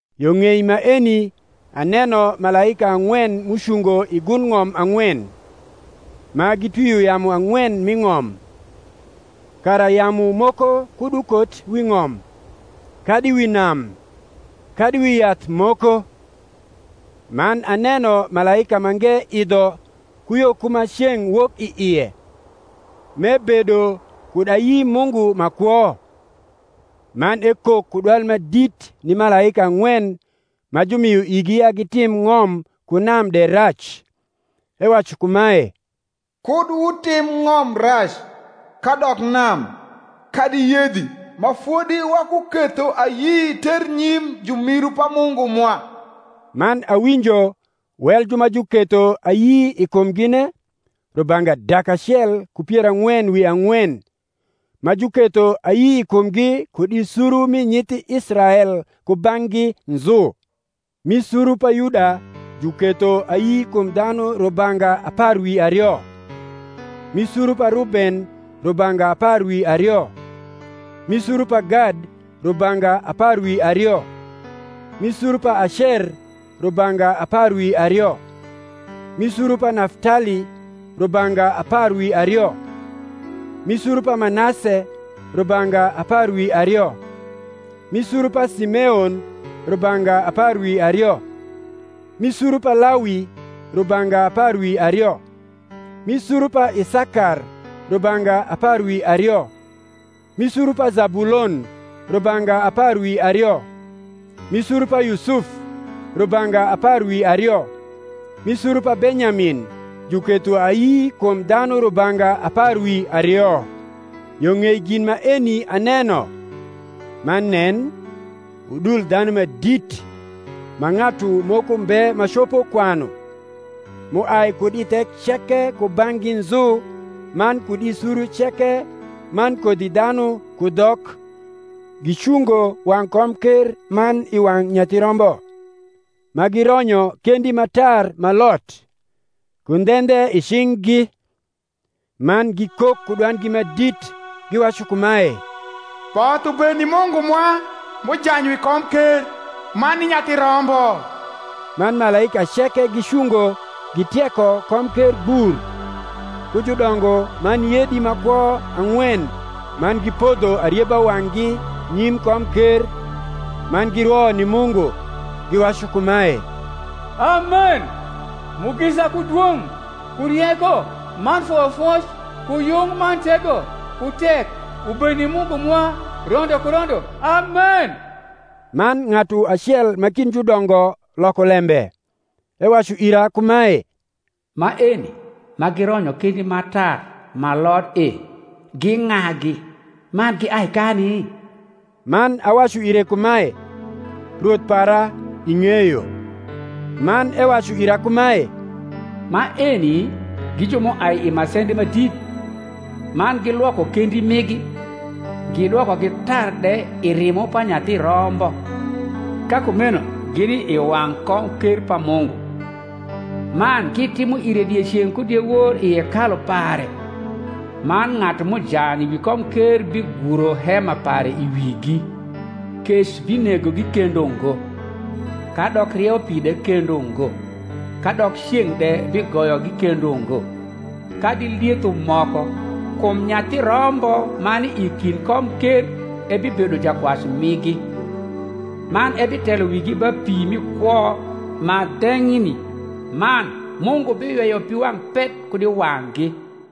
Yo ng’ei maeni aneno malaika ang’wen m’ucungo i gund ng’om ang’wen, ma gitwio yamu ang’wen mi ng’om, kara yamu moko kud ukot wi ng’om, kadi wi nam, kadi wi yath moko. Man aneno malaika mange idho ku yo ku ma ceng’ wok i ie, m’ebedo kud ayi Mungu ma kwo: man ekok ku dwal ma dit ni malaika ang’wen ma jumio igi ya gitim ng’om ku nam de rac, ewacu kumae, Kud wutim ng’om rac, kadok nam, kadi yedhi, ma fodi wakuketho ayi ternyim jumiru pa Mungu mwa. Man awinjo wel ju ma juketho ayi i kumgine, rubanga dak acel ku pier ang’wen wi ang’wen, ma juketho ayi i kumgi kud i suru mi nyithi Israel kubang’gi nzu: Mi suru pa Yuda juketho ayi kum dha nu rubanga apar wi ario; Mi suru pa Ruben rubanga apar wi ario; Mi sura pa Gad rubanga apar wi ario; Mi suru pa Acer rubanga apar wi ario; Mi suru pa Naftali rubanga apar wi ario: Mi suru pa Manase rubanga apar wi ario; Mi suru pa Simeon rubanga apar wi ario; Mi suru pa Lawi rubanga apar wi ario; Mi suru pa Isakar rubanga apar wi ario; Mi suru pa Zabulon rubanga apar wi ario; Mi suru pa Yusuf rubanga apar wi ario; Mi suru pa Benyamin juketho ayi kum dhanu rubanga apar wi ario. Yo ng’ei gin maeni aneno, man nen, udul dhanu ma dit, ma ng’atu moko mbe ma copo kwanu, m’uai kud i thek ceke kubang’gi nzu man kud i suru ceke man kodhidhanu ku dhok, gicungo wang’ komker man i wang’ Nyathi Rombo, ma gironyo kendi ma tar ma lot, ku ndhendhe i cing’gi; man gikok ku dwandgi ma dit, giwacu kumae, Both ubed ni Mungu mwa m’ujany wi komker, man ni Nyathi Rombo. Man malaika ceke gicungo gitieko komker gbur, ku judongo man yedi ma kwo ang’wen man gipodho arieba wang’gi nyim komker, man girwo ni Mungu, giwacu kumae, Amen: Mugisa, ku dwong’, ku rieko, man foyofoc, ku yung, man tego, ku tek, ubed ni Mungu mwa rondo ku rondo. Amen. Man ng’atu acel ma kind judongo loko lembe, ewacu ira kumae, Maeni ma gironyo kendi ma tar ma lot e, gi ng’agi, man giai kani? Man awacu ire kumae, Rwoth para, ing’eyo. Man ewacu ira kumae, Maeni gi ju m’uai i masendi ma dit, man gilwoko kendi migi, gidwokogi tar de i rimo pa Nyathi Rombo. Ka kumeno gini i wang’ komker pa Mungu; man gitimo ire dieceng’ ku diewor i hekalu pare: man ng’atu m’ujany wi komker biguro hema pare i wigi. Kec binegogi kendo ngo, kadok rieupi de kendo ngo; kadok ceng’ de bigoyogi kendo ngo, kadi lietho moko: kum Nyathi Rombo ma ni i kind komker ebibedo jakwac migi, man ebitelo wigi ba pi mi kwo ma dhenyni: man Mungu biyweyo piwang’ pet kud i wang’gi.